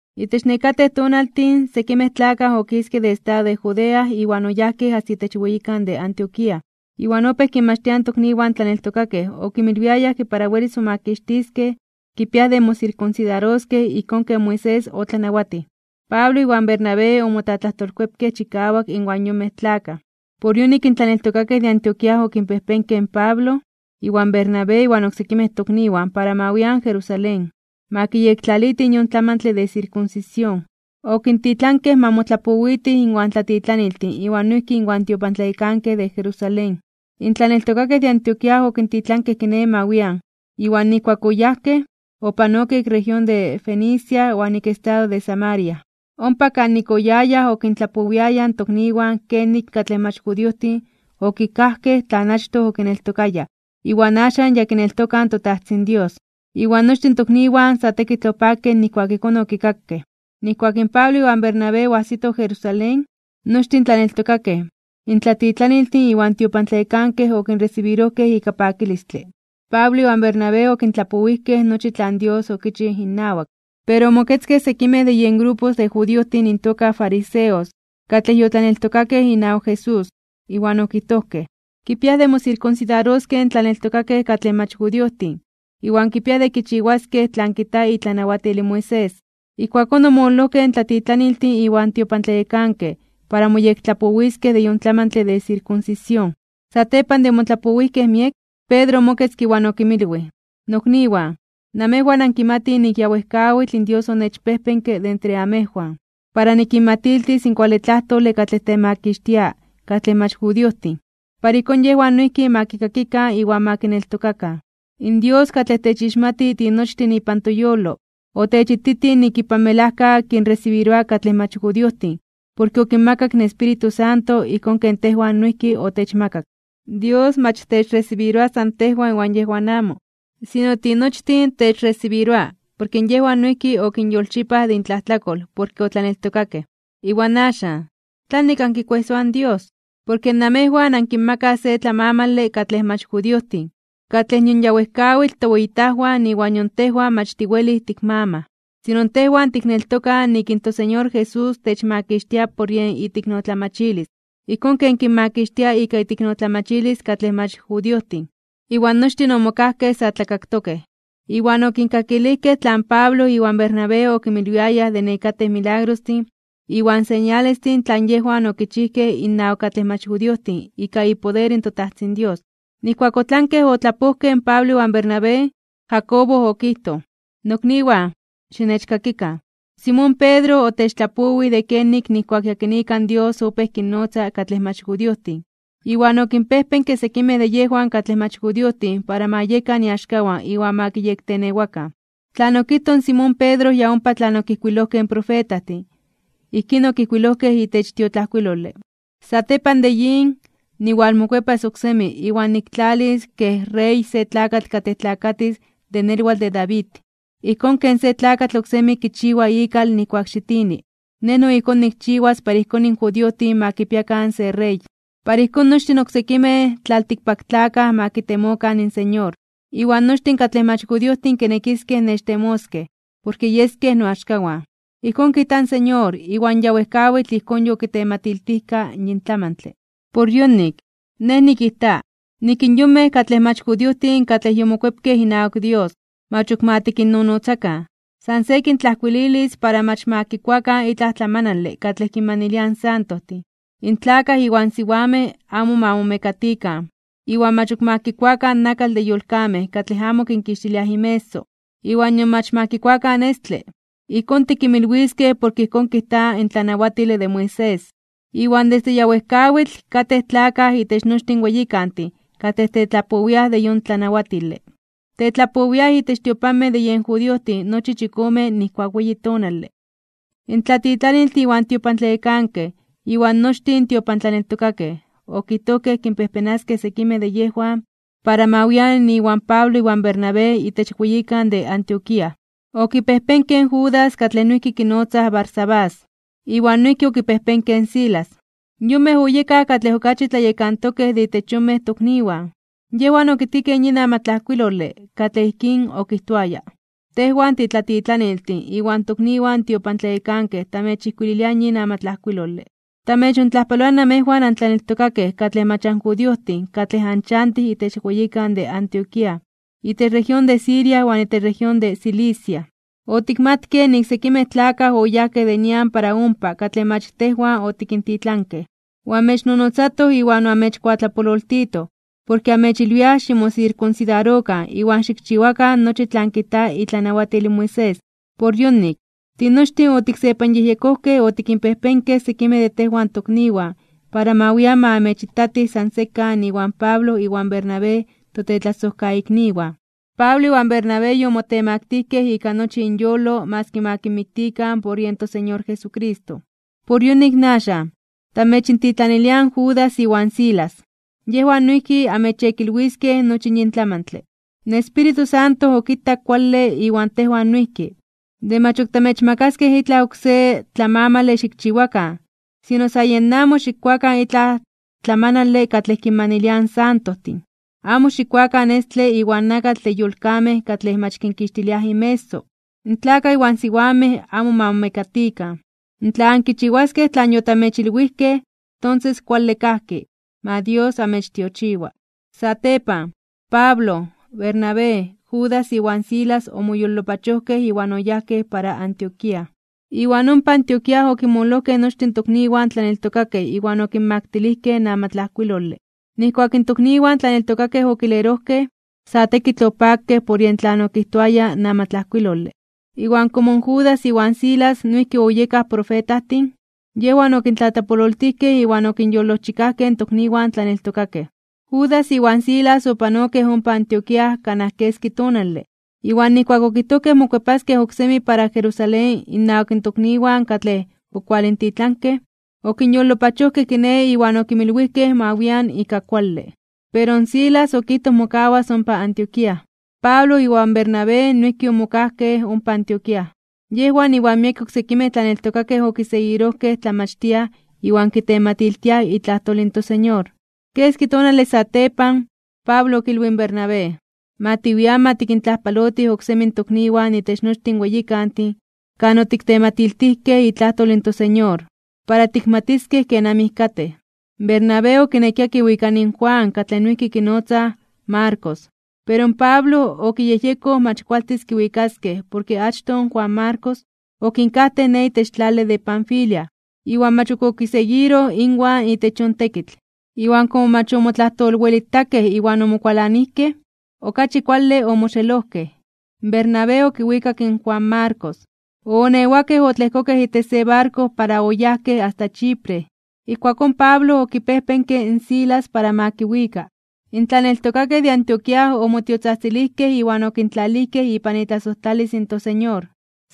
Itech nekatej tonaltin, sekimej tlakaj okiskej de estado de Judea iwan oyajkej asta itech weyikan de Antioquía. Iwan opéj kinmachtiaj in tokniwan tlaneltokakej okinmilwiayaj ke para welis momakixtiskej kipiaj de mosirkunsidaroskej ijkón ken Moisés otlanawatij. Pablo iwan Bernabé omotlatlajtolkuepkej chikawak inwan yonmej tlakaj. Por yonik in tlaneltokakej de Antioquía okinpejpenkej in Pablo, iwan Bernabé iwan oksekimej tokniwan para ma wian Jerusalén, ma kiyektlalitij yon tlamantle de sirkunsisión. Okintitlankej ma motlapowitij inwan tlatitlaniltin iwan noijki inwan tiopantlayekankej de Jerusalén. In tlaneltokakej de Antioquía okintitlankej kiné ma wian. Iwan nijkuak oyajkej, opanokej ik región de Fenicia iwan ik estado de Samaria. Ompa kanik oyayaj okintlapowiayaj in tokniwan kenik katlej mach judiojtin okikajkej tlan achtoj okineltokayaj iwan axan ya kineltokaj in toTajtzin Dios. Iwan nochtin in tokniwan sa tekitl opakej nijkuak ijkón okikakej. Nijkuak in Pablo iwan Bernabé oajsitoj Jerusalén, nochtin in tlaneltokakej, in tlatitlaniltin iwan in tiopantlayekankej okinresibirojkej ika pakilistle. Pablo iwan Bernabé okintlapowijkej nochi tlan Dios okichij innawak. Pero omoketzkej sekimej de yen grupo de judiojtin intoka fariseos katlej yotlaneltokakej inawak Jesús, iwan okijtojkej: ―Kipiaj de mosirkunsidaroskej in tlaneltokakej katlej mach judiojtin, iwan kipiaj de kichiwaskej tlan kijta itlanawatil in Moisés. Ijkuakón omololojkej in tlatitlaniltin iwan tiopantlayekankej para moyektlapowiskej de yon tlamantle de sirkunsisión. Satepan de omotlapowijkej miek, Pedro omoketzke iwan okinmilwij: ―Nokniwan, namejwan ankimatij nik ya wejkawitl in Dios onechpejpenke de entre amejwan, para nikinmatiltis in kuale tlajtole katlej temakixtia katlej mach judiojtin, para ijkón yejwan noijki ma kikakikan iwan ma kineltokakan. In Dios katlej techixmati tinochtin ipan toyolo, otechititij nik ipan melajka kinresibiroa katlej mach judiojtin porke okinmakak in Espíritu Santo ijkón ken tejwan noijki otechmakak. Dios mach techresibiroa san tejwan iwan yejwan amo, sino tinochtin techresibiroa, porke yejwan noijki okinyolchipaj de intlajtlakol porke otlaneltokakej. Iwan axan, ¿tlanik ankikuejsoaj in Dios? Porke namejwan ankinmakaj se tlamamale katlej mach judiojtin, katlej nion ya wejkawitl toweyitajwan iwan nion tejwan mach tiwelij tikmamaj. Sino tejwan tikneltokaj nik in toSeñor Jesús techmakixtia por yen iteiknotlamachilis, ijkón ken kinmakixtia ika iteiknotlamachilis katlej mach judiojtin. Iwan nochtin omokajkej sa tlakaktokej. Iwan okinkakilijkej tlan Pablo iwan Bernabé okinmilwiayaj de nekatej milagrostin iwan señalestin tlan yejwan okichijkej innawak katlej mach judiojtin ika ipoder in toTajtzin Dios. Nijkuak otlankej otlapojkej in Pablo iwan Bernabé, Jacobo okijtoj: ―Nokniwan, xinechkakikan. Simón Pedro otechtlapowij de kenik nijkuak yakinika in Dios opéj kinnotza katlej mach judiojtin, iwan okinpejpenke sekimej de yejwan katlej mach judiojtin para ma yekan iaxkawan iwan ma kiyektenewakan. Tlan okijtoj in Simón Pedro ya ompa tlan okijkuilojkej in profetajtin, ijkín okijkuilojkej itech tiotlajkuilole: Satepan de yin, niwalmokuepas oksemi iwan niktlalis kej rey se tlakatl katlej tlakatis de nelwatl de David. Ijkón ken se tlakatl oksemi kichiwa ikal nijkuak xitini, Nej no ijkón nikchiwas para ijkón in judiojtin ma kipiakan se rey. Para ijkón nochtin oksekimej tlaltikpaktlakaj ma kitemokan in Señor, iwan nochtin katlej mach judiojtin kinekiskej nechtemoskej, porke yeskej noaxkawan. Ijkón kijta in Señor, iwan ya wejkawitl ijkón yokitematiltijka yin tlamantle. ’Por yonik, nej nikijta, nik in yonmej katlej mach judiojtin katlej yomokuepkej inawak Dios, mach ok ma tikinnonotzakan. San se kintlajkuililis para mach ma kikuakan itlaj tlamanale katlej kinmaniliaj in santojtin, in tlakaj iwan siwamej amo ma momekatikan, iwan mach ok ma kikuakan nakatl de yolkamej katlej amo kinkixtiliaj inmeso, iwan nion mach ma kikuakan estle. Ijkón tikinmilwiskej porke ijkón kijta in tlanawatile de Moisés, iwan desde ya wejkawitl katej tlakaj itech nochtin weyikantin katlej tetlapowiaj de yon tlanawatile. Tetlapowiaj itech tiopanmej de yen judiojtin nochi chikome nijkuak weyi tonale. In tlatitlaniltin iwan tiopantlayekankej, iwan nochtin in tiopantlaneltokakej, okijtojkej kinpejpenaskej sekimej de yejwan para ma wian iwan Pablo iwan Bernabé itech weyikan de Antioquía. Okipejpenkej in Judas katlej noijki kinotzaj Barsabás, iwan noijki okipejpenkej in Silas. Yonmej oyekaj katlej okachi tlayekantokej de itech yonmej tokniwan. Yejwan okitkikej yin amatlajkuilole, katlej ijkín okijtoaya: “Tejwan titlatitlaniltin iwan tokniwan tiopantlayekankej tamechijkuililiaj yin amatlajkuilole. Tamechontlajpaloaj namejwan antlaneltokakej katlej mach anjudiojtin katlej anchantij itech weyikan de Antioquía, itech región de Siria iwan itech región de Cilicia. Otikmatkej nik sekimej tlakaj oyajkej de nian para ompa katlej mach tejwan otikintitlankej, oamechnonotzatoj iwan oamechkuatlapololtitoj, porke amechilwiaj ximosirkunsidarokan iwan xikchiwakan nochi tlan kijta itlanawatil in Moisés. Por yonik, tinochtin otiksepanyejyekojkej otikinpejpenkej sekimej de tejwan tokniwan para ma wian ma amechitatij san sekan iwan Pablo iwan Bernabé totetlasojkaikniwan. Pablo iwan Bernabé yomotemaktijkej (omotemaktilijkej) ika nochi inyolo maski ma kinmiktikan por yen toSeñor Jesucristo. Por yonik axan, tamechintitlaniliaj in Judas iwan Silas, yejwan noijki anmechyekilwiskej nochi yin tlamantle. In Espíritu Santo okitak kuale iwan tejwan noijki, de mach ok tamechmakaskej itlaj oksé tlamamale xikchiwakan, sino san yen amo xikkuakan itlaj tlamanale katlej kinmaniliaj in santojtin. Amo xikkuakan estle iwan nakatl de yolkamej katlej mach kinkixtiliaj inmeso. In tlakaj iwan siwamej amo ma momekatikan. Tla ankichiwaskej tlan yotamechilwijkej, tonses kuale kajki. Ma Dios amechtiochiwa.” Satepan, Pablo, Bernabé, Judas iwan Silas omoyolopachojkej iwan oyajkej para Antioquía. Iwan ompa Antioquía okinmololojkej nochtin tokniwan tlaneltokakej iwan okinmaktilijkej in amatlajkuilole. Nijkuak in tokniwan tlaneltokakej okilerojkej, sa tekitl opakej por yen tlan okijtoaya in amatlajkuilole. Iwan komo in Judas iwan Silas noijki oyekaj profetajtin, yejwan okintlatlapololtijkej iwan okinyolojchikajkej in tokniwan tlaneltokakej. Judas iwan Silas opanokej ompa Antioquía kanaj keski tonale. Iwan nijkuak okijtojkej mokuepaskej oksemi para Jerusalén innawak tokniwan katlej okualintitlankej, okinyolopachojkej kiné iwan okinmilwijkej ma wian ika kuale. Pero in Silas okijtoj mokawas ompa Antioquía. Pablo iwan Bernabé noijki omokajkej ompa Antioquía. Yejwan iwan miekej oksekimej tlaneltokakej okiseguirojkej tlamachtiaj iwan kitematiltiaj itlajtol in toSeñor. Keski tonale satepan, Pablo okilwij in Bernabé: ―Ma tiwian ma tikintlajpalotij oksemi in tokniwan itech nochtin in weyikantin kan otiktematiltijkej itlajtol in toSeñor, para tikmatiskej kenamij katej. Bernabé okinekia kiwikani in Juan katlej noijki kinotzaj Marcos, pero in Pablo okiyejyekoj mach kualtis kiwikaskej porke achtoj in Juan Marcos okinkajtej ne itech tlale de Panfilia iwan mach ok okiseguiroj inwan itech yon tekitl. Iwan komo mach omotlajtolwelitakej iwan omokualanijkej, okachi kuale omoxelojkej. Bernabé okiwikak in Juan Marcos, oonewakej otlejkokej itech se barko para oyajkej asta Chipre. Ijkuakón Pablo okipejpenke in Silas para ma kiwika. In tlaneltokakej de Antioquía omotiotzajtzilijkej iwan okintlalijkej ipan itlasojtlalis in toSeñor.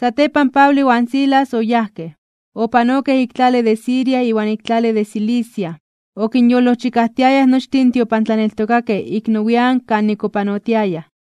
Satepan in Pablo iwan Silas oyajkej. Opanokej ik tlale de Siria iwan ik tlale de Cilicia. Okinyolojchikajtiayaj nochtin in tiopantlaneltokakej ik nowian (nian nepa) kanik opanotiayaj.